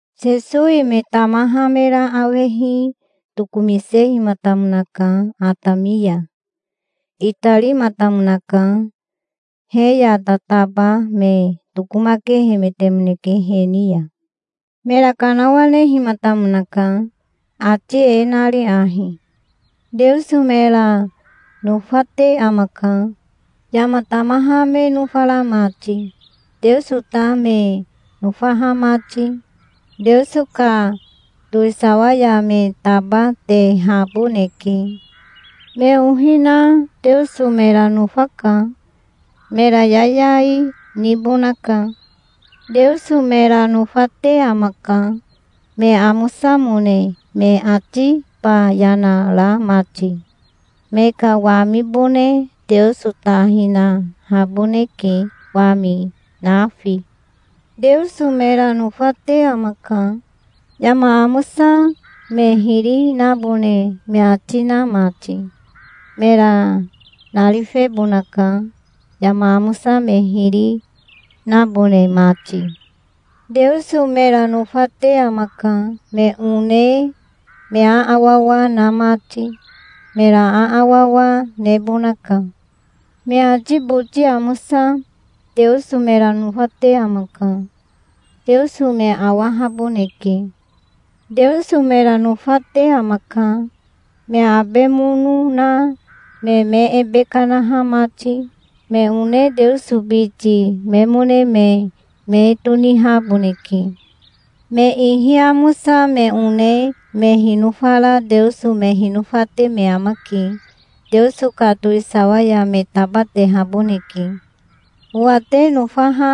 Sesowi me tamaha mera awehi tokomisehimatamonaka atami ya. Itarimatamonaka. He ya tataba me tokomakehemetemoneke he ni ya. Mera kanawanehimatamonaka, ati e nari ahi: "Teoso mera nofate amaka, yama tamaha me nofara mati, Teoso ta me nofaha mati. Teoso ka towisawa ya me tabatehaboneke". "Me ohi na Teoso mera nofaka. Mera yayai nibonaka". "Teoso mera nofate amaka, me amosamone me atiba yana ra mati. Me ka wamibone Teoso ta hinahaboneke, wami nafi". "Teoso mera nofate amaka, yama amosa me hiri nabone me ati na mati. Mera narifebonaka, yama amosa me hiri nabone mati". "Teoso mera nofate amaka, me one me aawawa na mati. Mera aawawa nebonaka". "Me ati boti amosa Teoso mera nofate amaka. Teoso me awahaboneke". "Teoso mera nofate amaka, me abe mono na me me ebe kanaha mati. Me one Teoso biti memone me me tonihaboneke". "Me ihi amosa me one me hinofara Teoso me hinofate me amake. Teoso ka towisawa ya me tabatehaboneke". "Owa te nofaha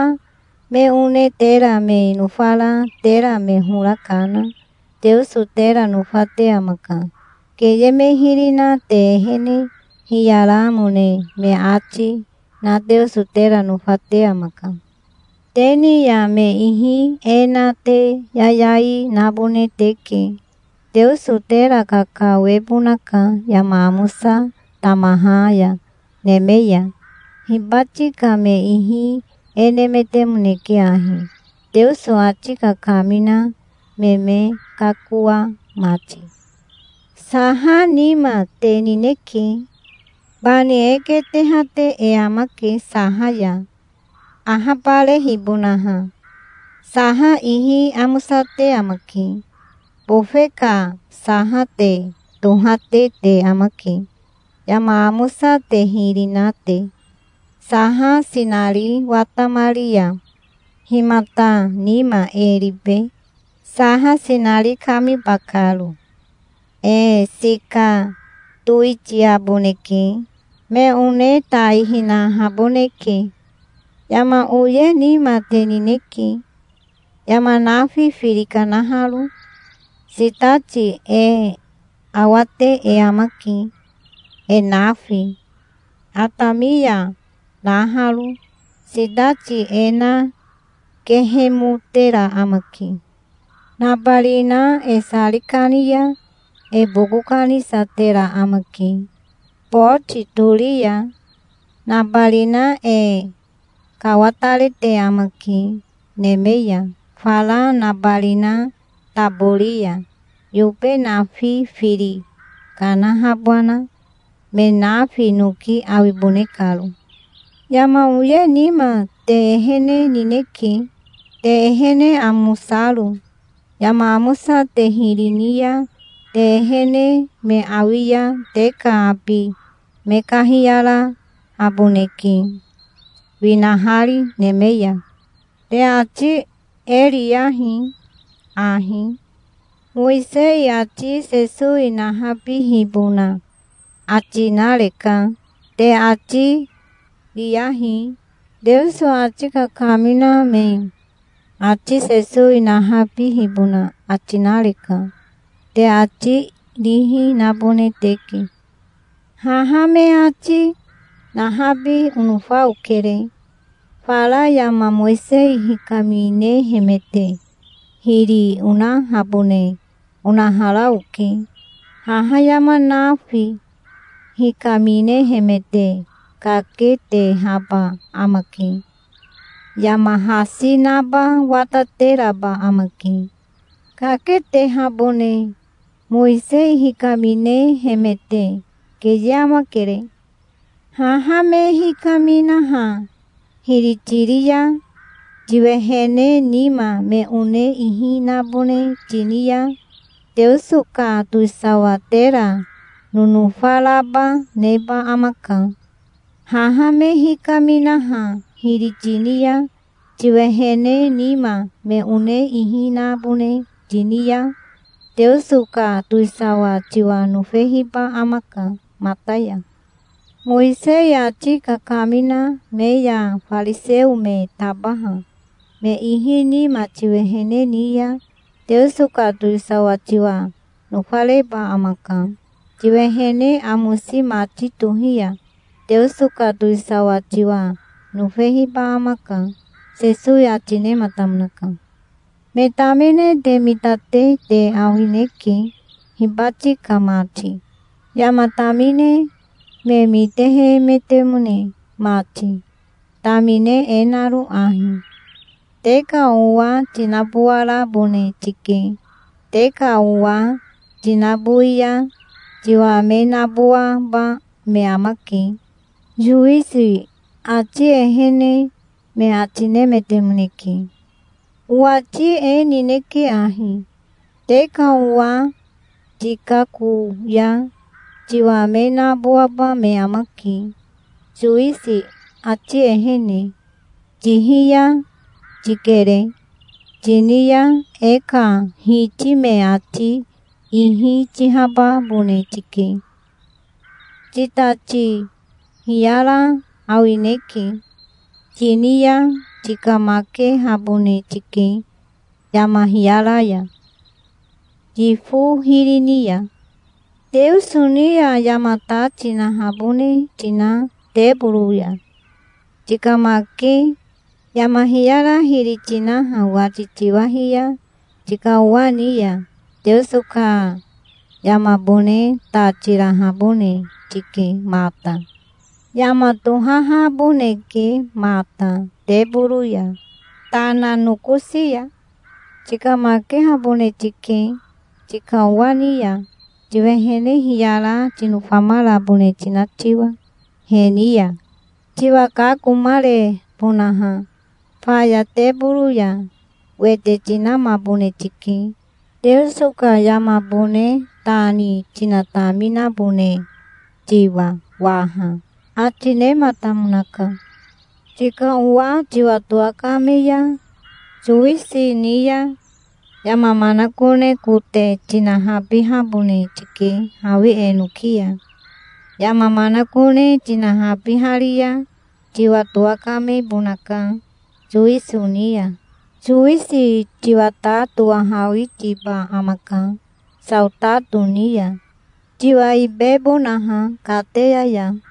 me one tera me nofara tera me hora kana Teoso tera nofate amaka. Keye me hiri na te ehene hiyaramone me ati na Teoso tera nofate amaka. Te ni ya me ihi e na te yayai nabone teke. Teoso tera kakawebonaka yama amosa tamaha ya neme ya. Hibati ka me ihi e nemetemoneke ahi, Teoso ati kakamina me me kakoa mati". "Saha nima te nineke. Bani e ketehate e amake saha ya, ahabarehibonaha. Saha ihi amosate amake. Bofe ka saha te tohate te amake, yama amosa te hiri na te. Saha sinari watamari ya himata nima e ribe, saha sinari kamiba karo?. E sika towitiaboneke. Me one tai hinahaboneke". "Yama oye nima te nineke, yama nafi firi kanaharo. Sitati e awate e amake, e nafi, atami ya naharo. Sitati e na kehemotera amake. Nabarina e sari kani ya e boko kanisatera amake boti tori ya. Nabarina e kawatarete amake neme ya fara nabarina tabori ya, yobe nafi firi kanahabana, me nafi noki awibone karo". "Yama oye nima te ehene nineke, te ehene amosaro. Yama amosa te hiri ni ya te ehene me awi ya te ka abi me kahiyarahaboneke, winahari neme ya". "Te ati e riyahi ahi. 'Mowisei ati Sesowi nahabihibona ati nareka', te ati riyahi. 'Teoso ati kakamina me ati Sesowi nahabihibona ati nareka', te ati rihi nabone teke. Haha me ati nahabi onofa okere. Fara yama Mowisei hikaminehemete hiri onahabone onahara oke. Haha yama nafi hikaminehemete kaketehaba amake. Yama hasi naba watateraba amake, kaketehabone Mowisei hikaminehemete. Keye amakere. Haha me hikaminaha hiri tiri ya, tiwehene nima me one ihi nabone tini ya, Teoso ka towisawa tera nonofa raba neba amaka. Haha me hikaminaha hiri tini ya, tiwehene nima me one ihi nabone tini ya, Teoso ka towisawa tiwa nofehiba amaka mata ya. Mowisei ati kakamina me ya fariseo me tabaha me ihi nima tiwehene ni ya Teoso ka towisawa tiwa nofareba amaka. Tiwehene amosi mati tohi ya Teoso ka towisawa tiwa nofehiba amaka", Sesowi ati nematamonaka. "Me tamine te mitate te awineke hibati ka mati, yama tamine me mitehemetemone mati, tamine e naro ahi: 'Te ka owa tinabowarabone tike. Te ka owa tinabowi ya tiwa me nabowaba me amake, sowisi ati ehene', me ati nemetemoneke. Owati e nineke ahi: Te ka owa tikako ya tiwa me nabowaba me amake, sowisi ati ehene. 'Tihiya tikere', tini ya e ka Hiti me ati ihi tihababone tike. 'Titati hiyara awineke', tini ya tikamakehabone tike yama hiyara ya, yifo hiri ni ya. Teoso ni ya yama ta tinahabone tina teboro ya tikamake, yama hiyara hiri tinaha wati tiwahi ya tika owa ni ya, Teoso ka yamabone ta tirahabone tike mata. Yama tohahaboneke mata teboro ya, tana nokosi ya. Tikamakehabone tike tika owa ni ya, tiwehene hiyara tinofamarabone tina tiwa he ni ya, tiwa kakomarebonaha. Faya teboro ya wete tinamabone tike, Teoso ka yamabone ta ni tinataminabone tiwa waha", ati nematamonaka. "Tika owa tiwa towakame ya sowisi ni ya, yama manakone kote tinahabihabone tike hawi enoki ya. Yama manakone tinahabihari ya tiwa towakamebonaka sowisi ni ya. Sowisi tiwa ta towahawitiba amaka saotato ni ya, tiwa ibebonaha kateya ya.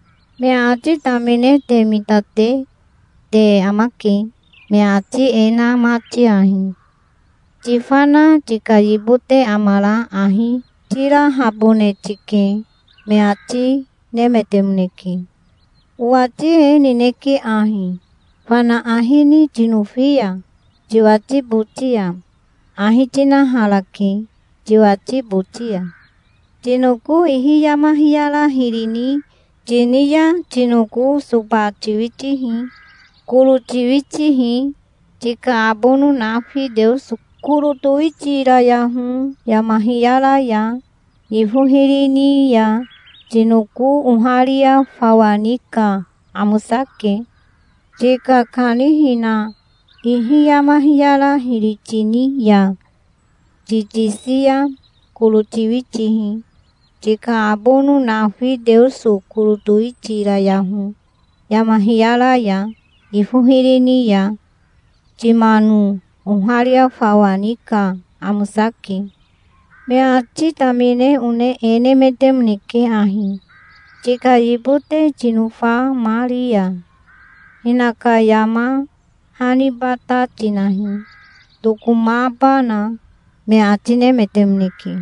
"Me ati tamine te mitate te amake, me ati e na mati ahi: 'Tifana tika yibote amara ahi tirahabone tike', me ati nemetemoneke. Owati e nineke ahi: Fana ahi ni tinofi ya tiwati boti ya, ahi tinaharake tiwati boti ya. Tinoko ihi yama hiyara hiri tini ya tinoko soba tiwitihi. Koro tiwitihi. Tika abono nafi Teoso koro towitirayaho yama hiyara ya, yifo hiri ni ya. Tinoko oharia fawa ni ka amosake. Tika kanihina ihi yama hiyara hiri tini ya ti tisi ya koro tiwitihi. Tika abono nafi Teoso koro towitirayaho yama hiyara ya, yifo hiri ni ya. Timano oharia fawa ni ka amosake". "Me ati tamine one e nemetemoneke ahi: 'Tika yibote tinofamari ya hinaka yama haniba ta tinahi, tokomabana', me ati nemetemoneke.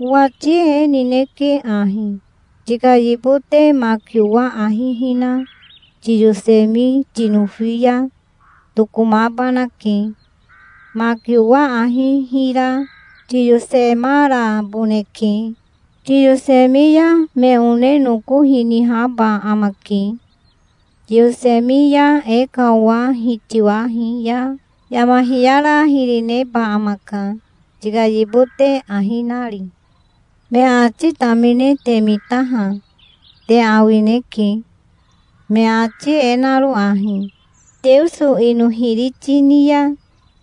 Owati e nineke ahi: tika yibote maki owa ahi hina toyosemi tinofi ya tokomabanake. Maki owa ahi hira tiyosemaraboneke. Tiyosemi ya me one noko hinihaba amake. Tiyosemi ya e ka owa hitiwahi ya yama hiyara hiri neba amaka, tika yibote ahi nari". "Me ati tamine te mitaha te awineke, me ati e naro ahi: 'Teoso ino hiri tini ya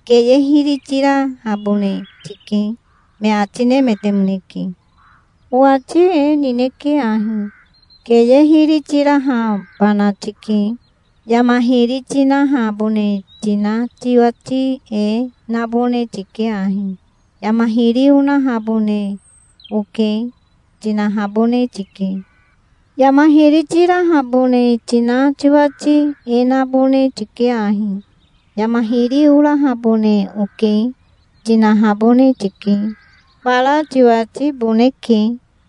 keye hiri tirahabone tike', me ati nemetemoneke. Owati e nineke ahi: Keye hiri tirahabana tike. Yama hiri tinahabone tina tiwati e nabone tike ahi: 'Yama hiri onahabone oke', tinahabone tike. Yama hiri tirahabone tina tiwati e nabone tike ahi: 'Yama hiri orahabone oke', tinahabone tike. Fara tiwatiboneke.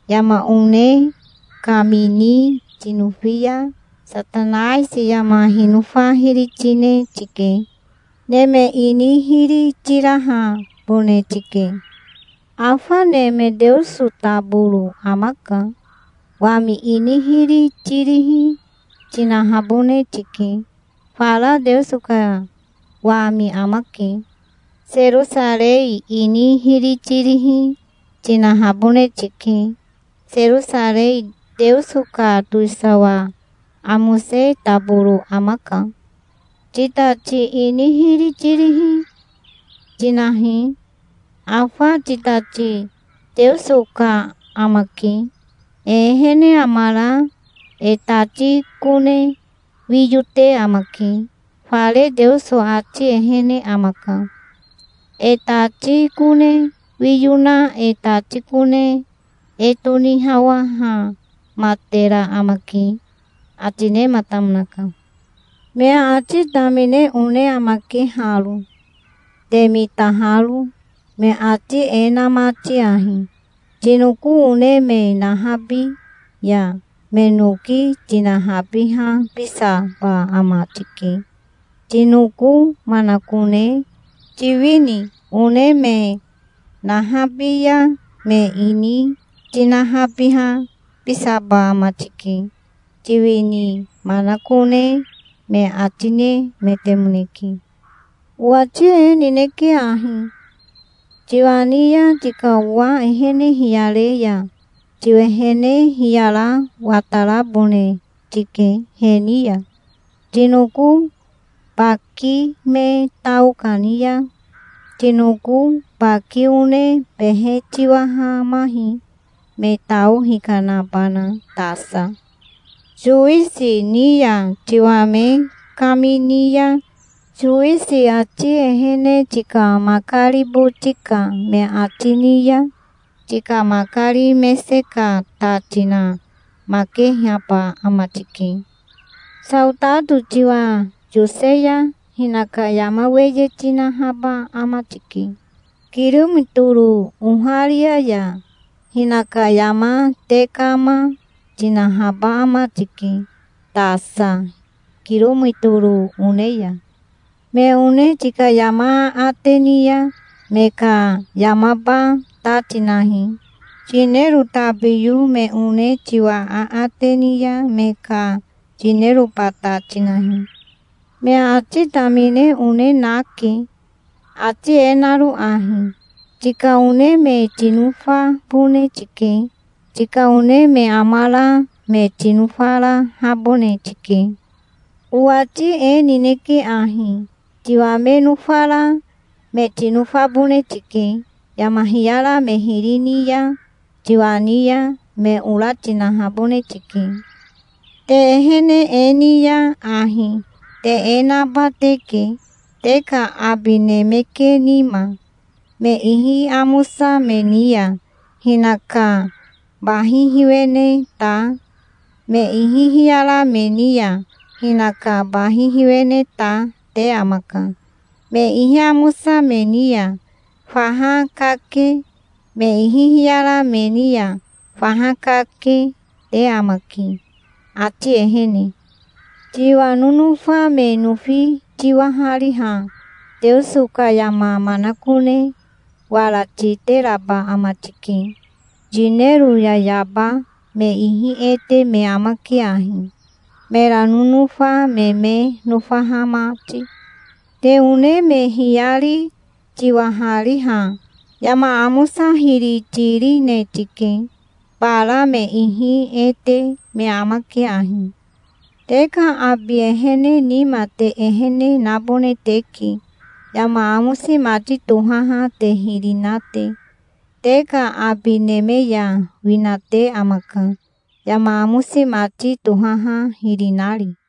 Yama one kamini tinofi ya Satanaisi yama hinofa hiri tine tike. Neme ini hiri tirahabone tike. Afa neme Teoso taboro amaka. Wami ini hiri tirihi, tinahabone tike. Fara Teoso ka wami amake. Serosarei ini hiri tirihi, tinahabone tike. Serosarei Teoso ka towisawa amose taboro amaka. Titati ini hiri tirihi tinahi. Afa titati Teoso ka amake. E ehene amara e tati kone wiyo te amake. Fare Teoso ati ehene amaka. E tati kone wiyo na e tati kone e tonihawahamatera amake", ati nematamonaka. "Me ati tamine one amake haro, te mitaharo, me ati e na mati ahi: 'Tinoko one me nahabi ya me noki tinahabihabisaba ama tike, tinoko manakone. Tiwini one me nahabi ya me ini tinahabihabisaba ama tike, tiwini manakone', me ati nemetemoneke. Owati e nineke ahi. Tiwa ni ya tika owa ehene hiyare ya tiwehene hiyara watarabone tike he ni ya. Tinoko baki me tao kani ya tinoko baki one behe tiwahamahi, me tao hikanabana tasa. Sowisi ni ya tiwa me kamini ya sowisi ati ehene tika makari boti ka me ati ni ya, tika makari mese ka ta tinamakehaba ama tike. Saotato tiwa yose ya hinaka yama weye tinahaba ama tike, kirometoro oharia ya. Hinaka yama tekama tinahaba ama tike tasa kirometoro one ya. Me one tika yama aate ni ya me ka yamaba ta tinahi. Yinero tabiyo me one tiwa aate ni ya me ka yineroba ta tinahi". "Me ati tamine one nake, ati e naro ahi: 'Tika one me tinofabone tike. Tika one me amara me tinofarahabone tike'. Owati e nineke ahi: Tiwa me nofara me tinofabone tike. Yama hiyara me hiri ni ya tiwa ni ya, me ora tinahabone tike. Te ehene e ni ya ahi te e naba teke, te ka abi neme ke nima. Me ihi amosa me ni ya hinaka bahi hiwene ta, me ihi hiyara me ni ya hinaka bahi hiwene ta, te amaka. Me ihi amosa me ni ya faha kake, me ihi hiyara me ni ya faha kake, te amake, ati ehene. Tiwa nonofa me nofi tiwahariha Teoso ka yama manakone wara titeraba ama tike. Yinero yayaba me ihi e te me amake ahi, mera nonofa me me nofaha mati. Te one me hiyari tiwahariha yama amosa hiri tirine tike. Bara me ihi e te me amake ahi. Te ka abi ehene nima te ehene nabone teke, yama amosi mati tohaha te hiri na te. Te ka abi neme ya winate amaka, yama amosi mati tohaha hiri nari".